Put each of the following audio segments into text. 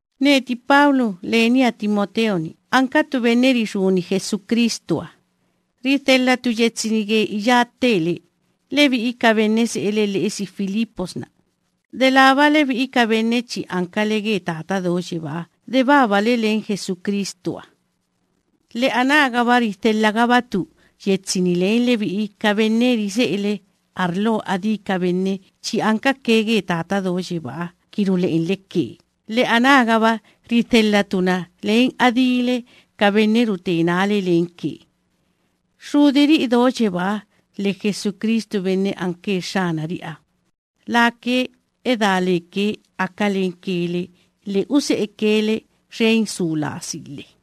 Neti Pablo lenia Timoteo‑ni ankatu benne rixúni Jesucristuha. Ridhelhatu yetsi‑ni ge iyá ttele, lebi'i ka benne se'ele lhe'esi Filipos‑na, delába lebi'i ka benne chi ankale ge Tata Do Yebáha de babale len Jesucristuha. Lhe anágaba ridhelhagabatu yetsi‑ni len lebi'i ka benne rise'ele arlo adí ka benne chi ankake ge Tata Do Yebáha ki rule'enle ke, lhe anágaba ridhelhatu yetsi‑ni len adíle ka benne rute nále lenke. Xxudiri'i do yebáha lhe Jesucristu benne anke Xxanari'iha, lake edá leke aka lenke le lhe use'eke le xen su lasi lhe.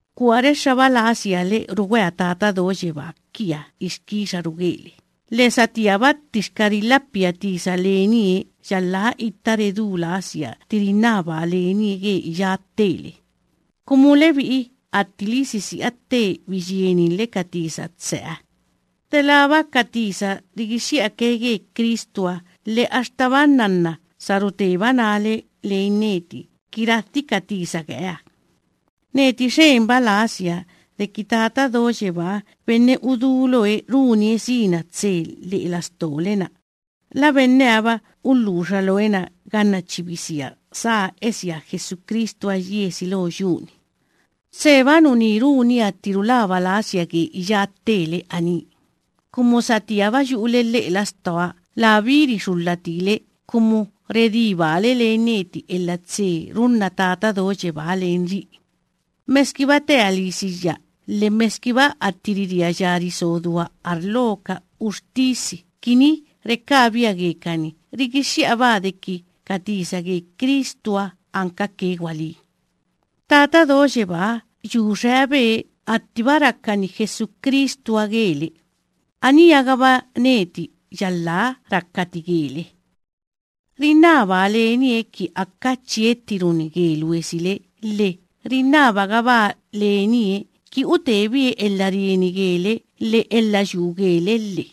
Kua rexxaba lasia le rugwea Tata Do Yebaa kiaha ixkixaru gele, lhe satíaba ttixka rilhapia tisa lenie yalhá itta redú lasia tti rinnabaa lenie ge iyá ttele, kumu lebi'i attili sisi'a tte biyieninle ka tisa tseha, delába ka tisa rigixxi'ake ge Cristuha lhe axtaba nnanna sa ruteba nále len neti ki radhi ka tisa geeha. Neti xenba lasia deki Tata Do Yebaa benne uduloe runie sina tse lhe'e lastole‑na, la benneha‑ba ulhuxa looe na ganna chi bisia sá esia Jesucristuha yiesi lo yu‑ni. Tseba nuní runia tti rulaba lasia ge iyá ttele aní, kumu satíaba yu'ule lhe'e lastoa, labí rixulhati le kumu redí baale len neti elha tse runna Tata Do Yebáha lenri'i, meskiba tea lisiyya lhe meskiba atti ririaya riso dua arlo ka uxtisi kini rekabia gekani, rigixxi'abaa deki ka tisa ge Cristuha ankake gwalí. Tata Do Yebáha yu xeabe attiba rakani Jesucristuha gele, aníha‑gaba neti yalhá rakati gele. Rinnabaa lenie ki aka chiettiruni ge luesile, lhe rinnabagabaa lenie ki utebie elha rieni gele lhe elha yuu gele lhe.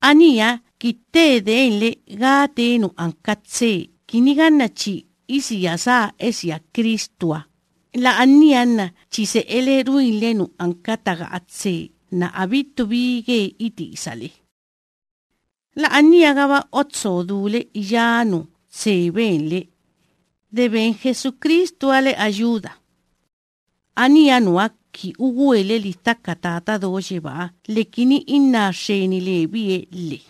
Aníha ki tte denle gá tee nu anka tse kini ganna chi isia sá esia Cristuha, la'ania nna chi se'ele ruinle nu anka taga'a tse nna abittu bi ge itisale. La'aniagaba otso dule iyá nu tse benle, de ben Jesucristuha le ayuda. Aníha nuha ki ugwele lidhaka Tata Do Yebáha lhe kini inná xxeni lebie lhe.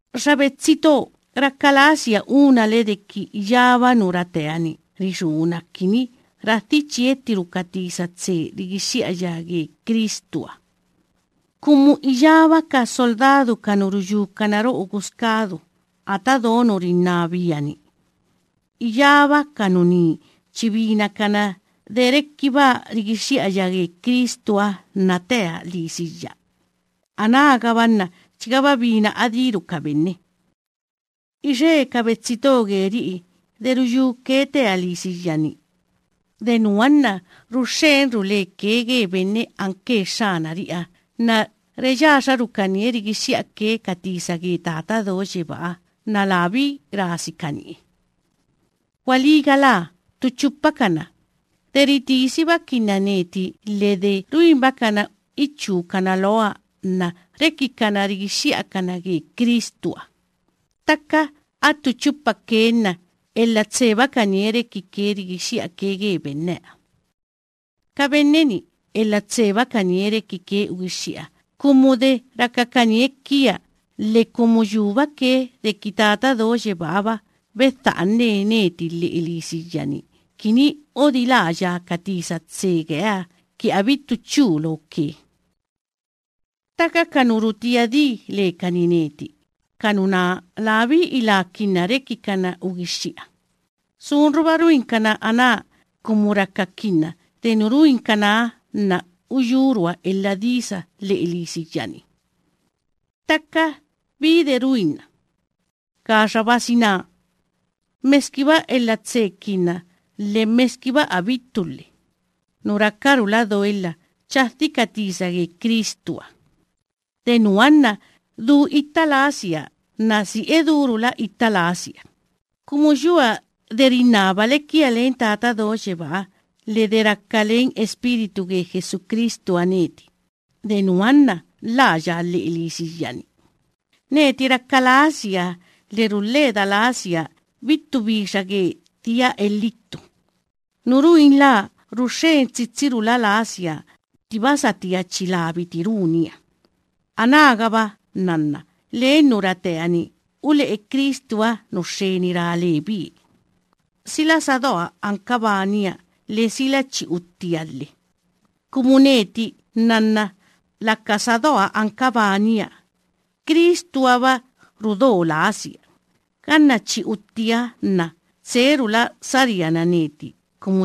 Xa betsi to, raka lasia unale deki iyába nu ratea‑ni rixúna kini radhi chiettiru ka tisa tse rigixxi'aya ge Cristuha, kumu iyába ka soldadu ka nu ruyúkana ro'o guskadu ata do nu rinnabia‑ni, iyába ka nuní chi binakana de rekibaa rigixxi'aya ge Cristuha nna tea lisiyya, anágaba nna chigaba bina adíru ka benne. Ixe ka betsi to geri'i de ruyúke tea lisiyya‑ni, de nuha nna ruxxenrula leke ge benne anke Xxanari'iha, nna reyaxarukanie rigixxi'ake ka tisa ge Tata Do Yebáha nna labí rasikanie. Gwalí galá ttu chupakana, de ritisibakinna neti lhe de ruinbakana ichúkana loa nna rekikana rigixxi'akana ge Cristuha; ttaka attu chupake nna elha tsebakanie rekike rigixxi'ake ge benneha. Ka benne‑ni elha tsebakanie rekike ugixxi'a, kumu de rakakanie kia lhe kumu yúbake deki Tata Do Yebáha‑ba bedha'ane neti lhe'e lisiyya‑ni, kini odiláya ka tisa tse geeha ki abittu chu loke. Ttaka ka nu rutía di lekani neti, ka nuná labí ilaakinna rekikana ugixxi'a. Sunruba ruinkana aná kumu rakakinna de nu ruinkanaha nna uyúrua elha disa lhe'e lisiyya‑ni. Ttaka, ¿bí de ruinna? Gaxabasina, meskiba elha tsekinna lhe meskiba abittu lhe, nu rakarula doelha chadhi ka tisa ge Cristuha. De nuha nna du itta lasia nna si edúrula itta lasia, kumu yua de rinnabale kia len Tata Do Yebáha lhe de raka len Espíritu ge Jesucristuha neti, de nuha nna lhaaya lhe'e lisiyya‑ni. Neti raka lasia lhe rulheda lasia abittu bixa ge dhia elhittu. Nu ruinlaa ruxxen tsitsirula lasia attiba satía chi labiti runia, anágaba nnanna len nu ratea‑ni ule'e Cristuha nu xxeni ra lebie, sila sa doa anka bania lhe sila chi uttia lhe. Kumu neti nnanna laka sa doa anka bania, Cristuha‑ba rudo lasia; ganna chi uttiaha nna tserula chi saríana neti.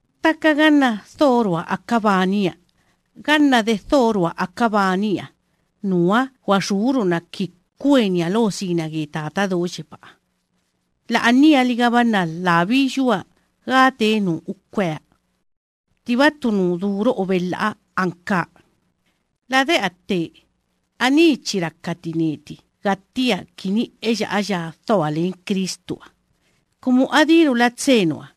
Ttaka ganna dhorua aka bania, ganna de dhorua aka bania, nuha gwaxúruna kini kwenia lo sina ge Tata Do Yebáha, la'anialigaba nna labí yua gá tee nu ukwea. Ttiba ttu nu du ro'o belha'a ankaa. Lade'a tte, aní chi rakati neti gattia kini eya'aya dhoa len Cristuha, kumu adírula tse nuha.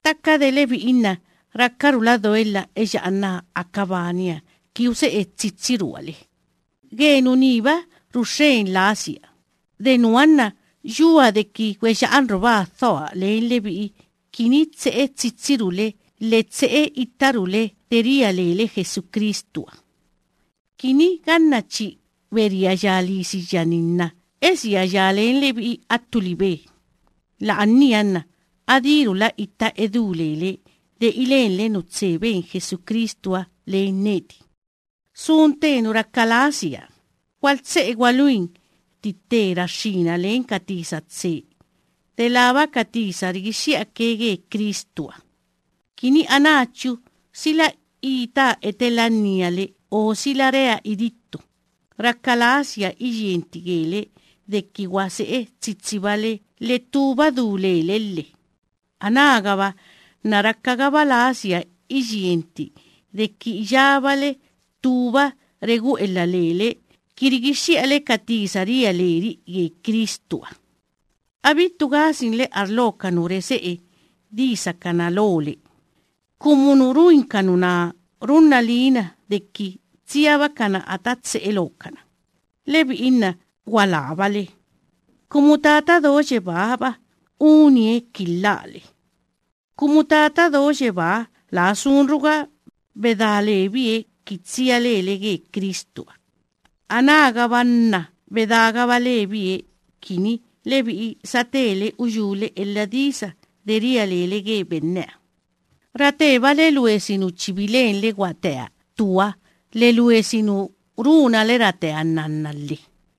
Ttaka de lebi'i nna rakarula doelha eya'anaa aka bania ki use'e tsitsirua le. Ge nuníba ruxxen lasia, de nuha nna yua deki gweya'anrubaa dhoa len lebi'i kini tse'e tsitsirule lhe tse'e ittarule de ria lele Jesucristuha, kini ganna chi beriaya lisiyya‑ni nna esiaya len lebi'i attu libe, la'ania nna adírula itta edú lele de ilenle nu tse ben Jesucristuha len neti. Sun tte nu raka lasia: gwaltse'e gwaluni tti tte raxxína len ka tisa tse, delába ka tisa rigixxi'ake ge Cristuha, kini anáchu sila itaa etelannia le o sila rea idittu, raka lasia iyienti gele deki gwa se'e tsitsibale lhe ttúba du lele lhe. Anágaba nna rakagaba lasia iyienti deki iyábale ttúba regu'elha lele ki rigixxi'ale ka tisa ria leri'i ge Cristuha. Abittu gasinle arlo ka nu rese'e disakana lole, kumu nu ruin ka nuná runna liina deki tsiabakana ata tse'e lookana, lebi'i nna gwalábale, kumu Tata Do Yebáha‑ba unie ki lhaale. Kumu Tata Do Yebáha laa sunruga bedá lebie tsia lele ge Cristuha, anágaba nna bedágaba lebie kini lebi'i satele uyúle elha disa de ria lele gebie. Ratebale luesi nu chi bilenle gwatea ttuha lhe luesi nu runale ratea nnanna lhe.